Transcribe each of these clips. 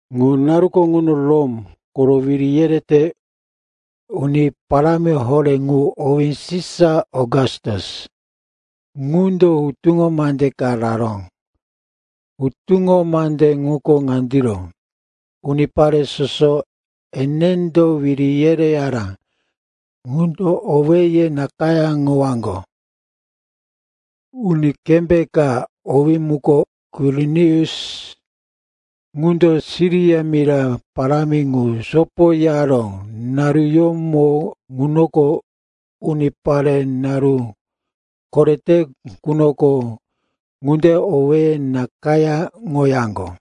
Ŋu naruko ŋuno Rom koro wiri yerete uni parámi horé ŋu, owí Sisa Okastus, ŋundo hutuŋo mande ka raró. Hutuŋo mande ŋuko ŋandiro: unipare soso enendo wiri yereyara ŋundo owéye nakayáŋowaŋgo. (Uni kembé ka, owí muko Kwirinius, ŋundo Siria mira parámi ŋu sopoyaró naruyómo ŋunoko, unipare naru korete qunoko ŋunde owéye nakayáŋoyaŋgo.)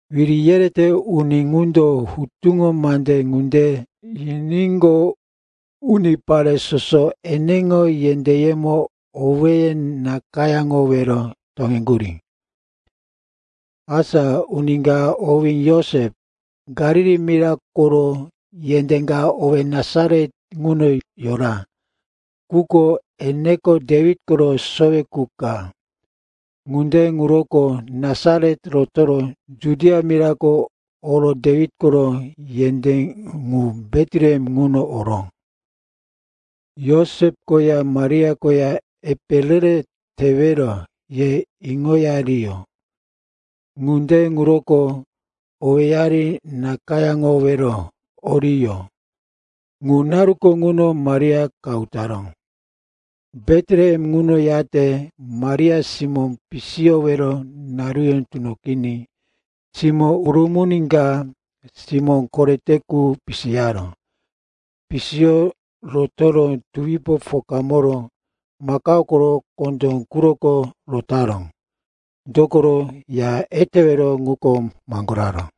Wiri yerete uni ŋundo hutuŋo mande ŋunde yiníqo, unipare soso eneŋo yendéyemo owéye nakayáŋowero toŋeŋgurí. Asa uni ka, owí Josep, Galili mira koro yendé ka owé Nasaret ŋuno yora. Quko eneko Dewit koro sowe qu ka. Ŋunde ŋuroko Nasaret rotoro Judia mirako oro Dewit koro yendé ŋu, Betlehem ŋuno oró. Josep koya Maria koya epe re-re tewero ye iŋoyariyó. Ŋunde ŋuroko owéyari nakayáŋowero oriyó. Ŋu naruko ŋuno Maria qahu taró. Betlehem ŋuno yate Maria simó pisiyowero naruyó tunoqiní simó urumuni ka, simó korete qu pisiyaró. Pisiyo rotoro tuwipo pokamoro makao koro kondó quroko rotaró, dokoro ya etewero ŋuko maŋgoraró.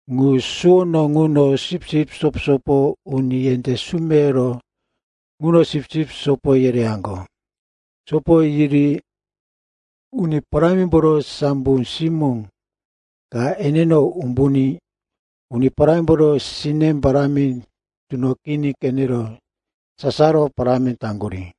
Ŋu suwono ŋuno sipsip sopo-sopo uni yendé sumeyoro ŋuno sipsip sopo yereyaŋgo. Sopo yiri Uni Parámimboro sambo simó ka eneno umbuní, Uni Parámimboro sine parámi tunoqiní qenero sasaro parámi taŋgurí.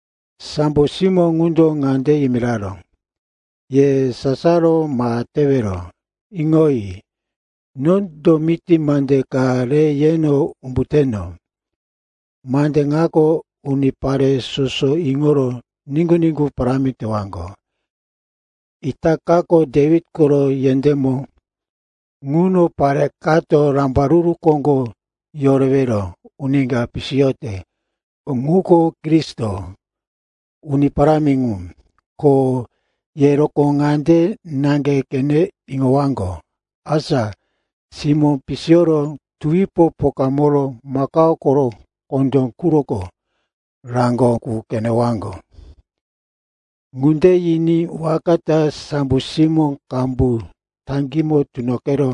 Sambo simó ŋundo ŋande yimiraró, “Ye sasaro ma tewero. Iŋoyi. Nondo miti mande ka re yeno umbuteno. Mande ŋako unipare soso iŋoro niŋgu-niŋgu parámi tewaŋgo. Itakako Dewit koro yendémo ŋuno pare kato Rambaruru Koŋgo Yorewero Uni ka pisiyote. Ŋuko Kristo, Uni Parámi ŋu. Ko ye rokó ŋande naŋge qene iŋowaŋgo, asa simó pisiyoro tuwipo pokamoro makao koro kondó quroko raŋgo qu qenewaŋgo.” Ŋunde yiní waka ta sambo simó qambu taŋgímo tunoqero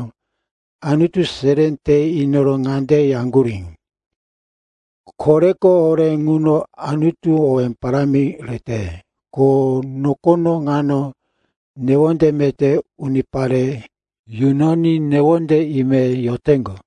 Anutu seré te inoro ŋande yaŋgurí, “Koreko horé ŋuno Anutuko owé parámi rete ko nokono ŋano newonde meté unipare yunoní newonde ime yoteŋgo.”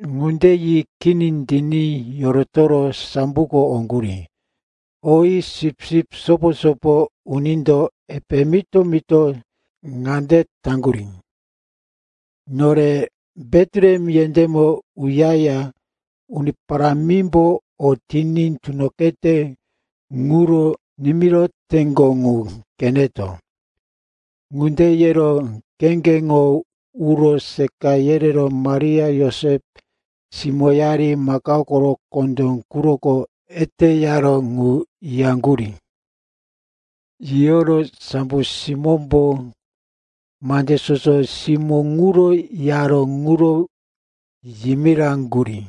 Ŋunde yi kini tiní yorotoro samboko oŋgurí. Oyi, sipsip sopo-sopo unindo epe mito-mito ŋande taŋgurí, “Nore Betlehem yendémo uyaya Uni Parámimbo o tiní tunoqete ŋuro nimiroteŋgo ŋu qeneto.” Ŋunde yero kheŋgeŋo uro seqa yerero Maria, Josep, simóyari makao koro kondó quroko eteyaró ŋu yiyaŋgurí. Yiyoro sambo simómbo mande soso simó ŋuro yaró ŋuro yimiraŋgurí.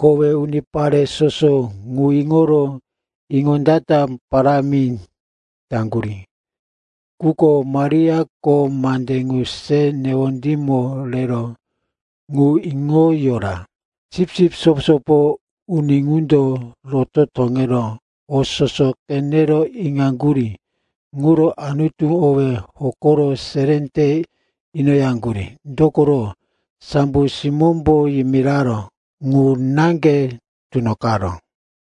Kowe unipare soso ŋu iŋoro iŋondata parámi taŋgurí. Quko Mariako mande ŋu re newondímo rero ŋu iŋo yora. Sipsip sopo-sopo uni ŋundo roto toŋero o soso qenero iŋaŋgurí ŋuro Anutu owí hokoro seré te inoyaŋgurí. Dokoro sambo simómbo yimiraró ŋu naŋge tunoqaró.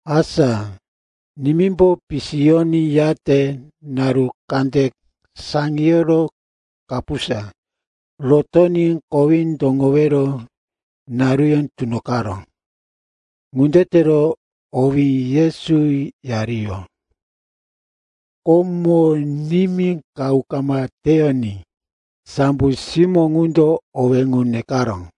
Asa nimímbo pisiyoní, yate naru kande saŋiyoro kapusa rotoní kowí toŋowero naruyó tunoqaró. Ŋunde tero owí Yesu yariyó. Komo, nimí qahu kama teyoní, sambo simó ŋundo owé ŋu nekaró.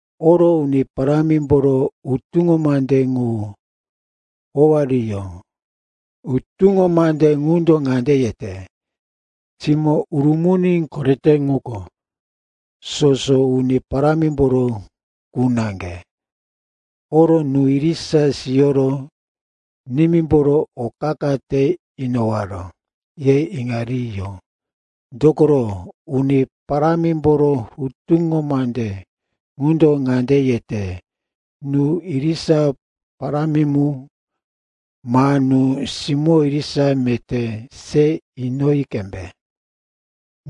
Oro Uni Parámimboro hutuŋo mande ŋu howariyó. Hutuŋo mande ŋundo ŋande yete, “Simó urumuni korete ŋuko soso Uni Parámimboro qu naŋge.” Oro nú irisa siyoro, nimímboro o qa-qa te inowaro, ye iŋariyó. Dokoro Uni Parámimboro hutuŋo mande ŋundo ŋande yete, “Nú irisa parámi mu ma nú simó irisa meté se inoyi qembe.”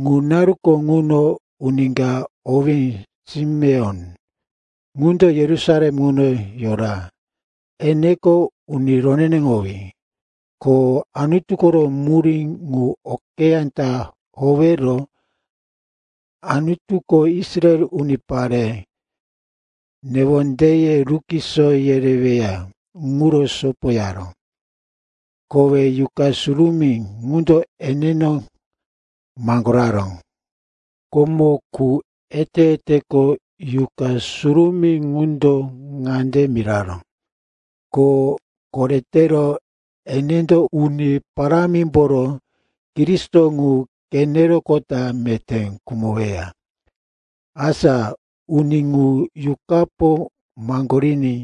Ŋu naruko ŋuno uni ka, owí Simeon, ŋundo Yerusalem ŋuno yora. Eneko uni roneneŋowí, ko Anutu koro murí ŋu okeyá ta howero Anutuko Israel unipare newondeye rukiso yereweya ŋuro sopoyara. Kowe Yuqa Surumí ŋundo eneno maŋgoraró. Komo qu ete-eteko Yuqa Surumí ŋundo ŋande miraró, ko koretero enendo Uni Parámimboro Kristo ŋu qeneroqota meté khumoweya. Asa uni ŋu, Yuqapo maŋgoriní,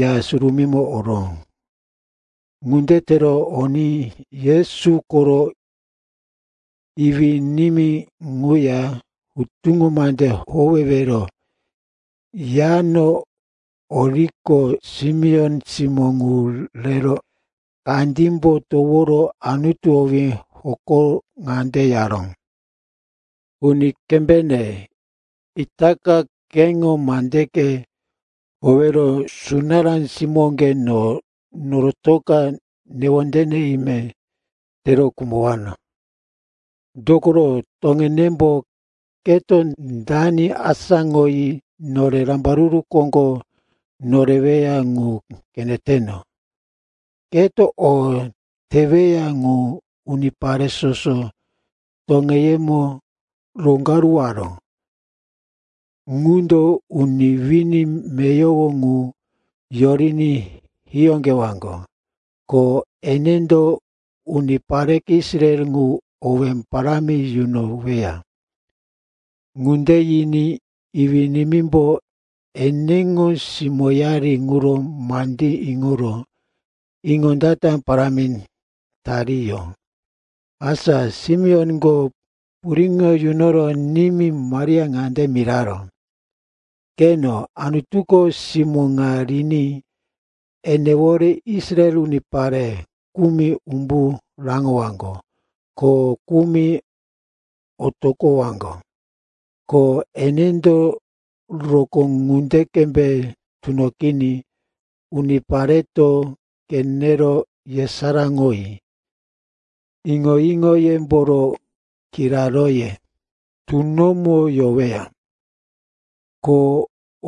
Ya Surumímo oró. Ŋunde tero oní Yesu koro iwí-nimí ŋuya hutuŋo mande howewero Yano oriqo, Simeon simó ŋu rero kandímbo toworo Anutu owí hokoro ŋande yaró, “Uni kembéŋe, itaka keŋo mandeke howero sunará simóŋge no norotoka newonde ime tero khumowano. Dokoro toŋenembo keto dani asáŋoyi nore rambaruru koŋgo noreweya ŋu qeneteno. Keto o teweya ŋu unipare soso toŋeyemo roŋgaruwaró. Ŋundo uni wini meyowo ŋu yoriní hiyóqewaŋgo, ko enendo unipareke Israel ŋu owé parámi yunoweya.” Ŋunde yiní iwí-nimímbo eneŋo simóyari ŋuro mandí iŋoro iŋondata parámi tariyó. Asa Simeonko puriŋo yunoro nimí Maria ŋande miraró, “Qeno, Anutuko simó ŋa riní enewore Israel unipare kumi umbu raŋowaŋgo, ko kumi otoqowaŋgo. Ko enendo rokó ŋunde qembe tunoqiní unipareto qenero yesaráŋoyi iŋo-iŋoyemboro kiraróye tunomo yoweya. Ko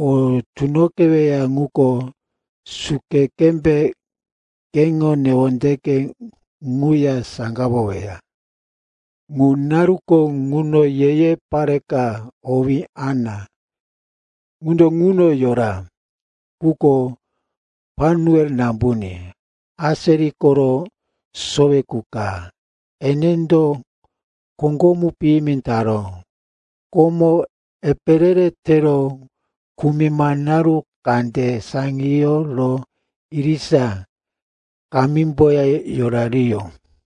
o tunoqeweya ŋuko suke qembe keŋo newondeke ŋuya saŋgawoweya.” Ŋu naruko ŋuno ye-ye pare ka, owí Ana, ŋundo ŋuno yora. Ŋuko Panuel nambuní, Aseri koro sowe qu ka. Enendo koŋgomu piyimi taró. Komo epe re-re tero kumima naru kande saŋiyoro irisa kamímboya yorariyó.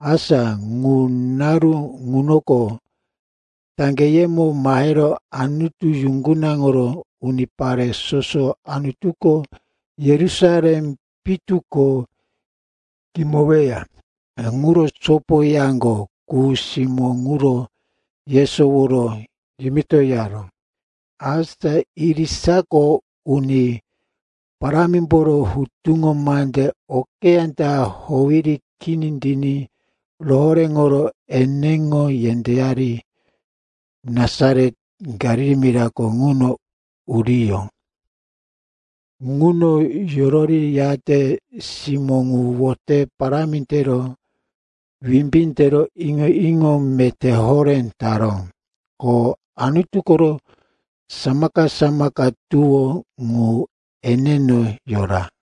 Asa ŋu naru ŋunoko taŋgeyemo mahero Anutu yuŋgunaŋoro unipare soso Anutuko Yerusalem pitu ko kimoweya ŋuro sopoyaŋgo qu simó ŋuro yesoworo yimitoyaró. Asa irisako Uni Parámimboro hutuŋo mande okeyá ta howiri kini tiní rohoréŋoro eneŋo yendéyari Nasaret, Galili mirako ŋuno uriyó. Ŋuno yororiyate simó ŋu wote parámi tero wimbí tero iŋo-iŋo meté horé taró. Ko Anutu koro samaka-samaka tuwó ŋu eneno yora.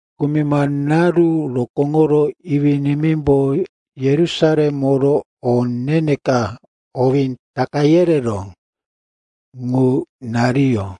Kumima naru rokóŋoro iwí-nimímbo Yerusalem oro o ne-ne ka, owí Taka yereró, ŋu nariyó.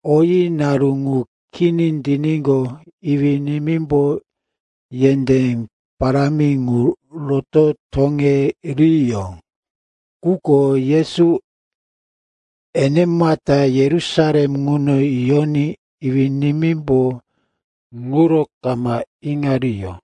Oyi naru ŋu kini tiníqo, iwí-nimímbo yendé parámi ŋu roto toŋeriyó. Quko Yesu enemata Yerusalem ŋuno yoní iwí-nimímbo ŋuro kama iŋariyó.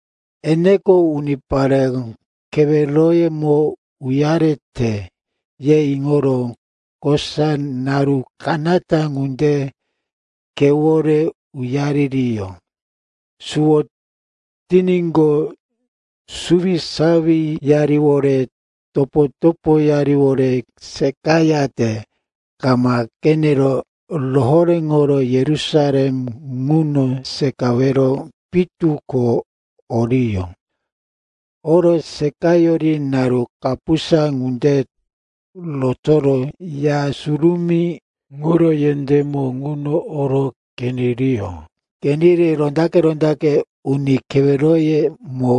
“Eneko unipare keweroyemo uyarete,” ye iŋoro kosa naru kanata ŋunde khewore uyaririyó. Suwo tiníqo, suwisawiyariwore topo-topoyariwore seqayate kama qenero rohoréŋoro Yerusalem ŋuno seqawero pitu ko oriyó. Oro seqayori naru kapusa ŋunde rotoro Ya Surumí ŋuro yendémo ŋuno oro qeneriyó. Qeniri rondaqe-rondaqe uni keweroyemo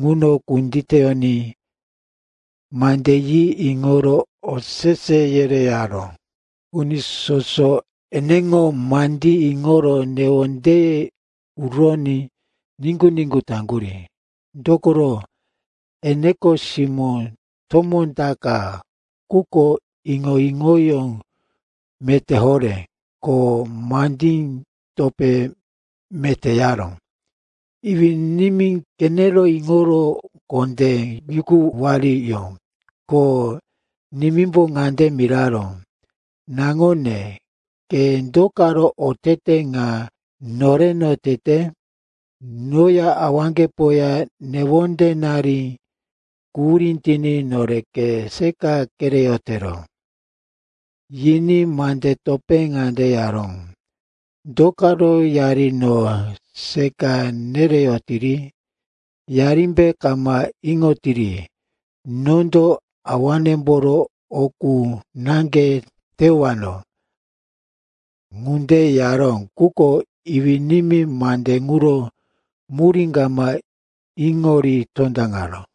ŋuno kunditeyoní mande yi iŋoro osese yereyaró. Uni soso eneŋo mandí iŋoro newondeye uroní niŋgu-niŋgu taŋgurí. Dokoro, eneko simó tomó ta ka, quko iŋo-iŋoyó meté horé, ko mande topé meté yaró. Iwí-nimí qenero iŋoro kondé yukuwariyó. Ko nimímbo ŋande miraró, “Naŋone, ke do karo otete ŋa noreno tete? Noya awaŋgepoya newondenari quhurí tiní nore ke seqa kereyotero.” Yiní mande topé ŋande yaró, “Do karo yari no seqa nereyotiri? Yarimbe kama iŋoyotiri, nondo awanemboro o qu naŋge teyowano?” Ŋunde yaró, quko iwí-nimí mande ŋuro murí kama iŋori tondaŋaró.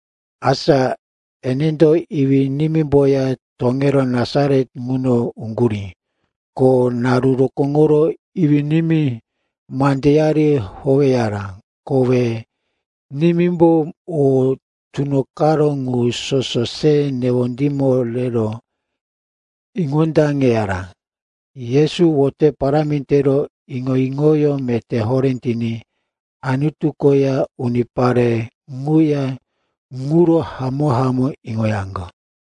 Asa enendo iwí-nimímboya toŋero Nasaret ŋuno uŋgurí. Ko naru rokóŋoro iwí-nimí mandeyari howeyara. Kowe nimímbo o tunoqaró ŋu soso se newondímo rero iŋondaŋeyara. Yesu wote parámi tero, iŋo-iŋoyó meté horé tiní Anutu koya unipare ŋuya ŋuro hamó-hamó iŋoyaŋgo.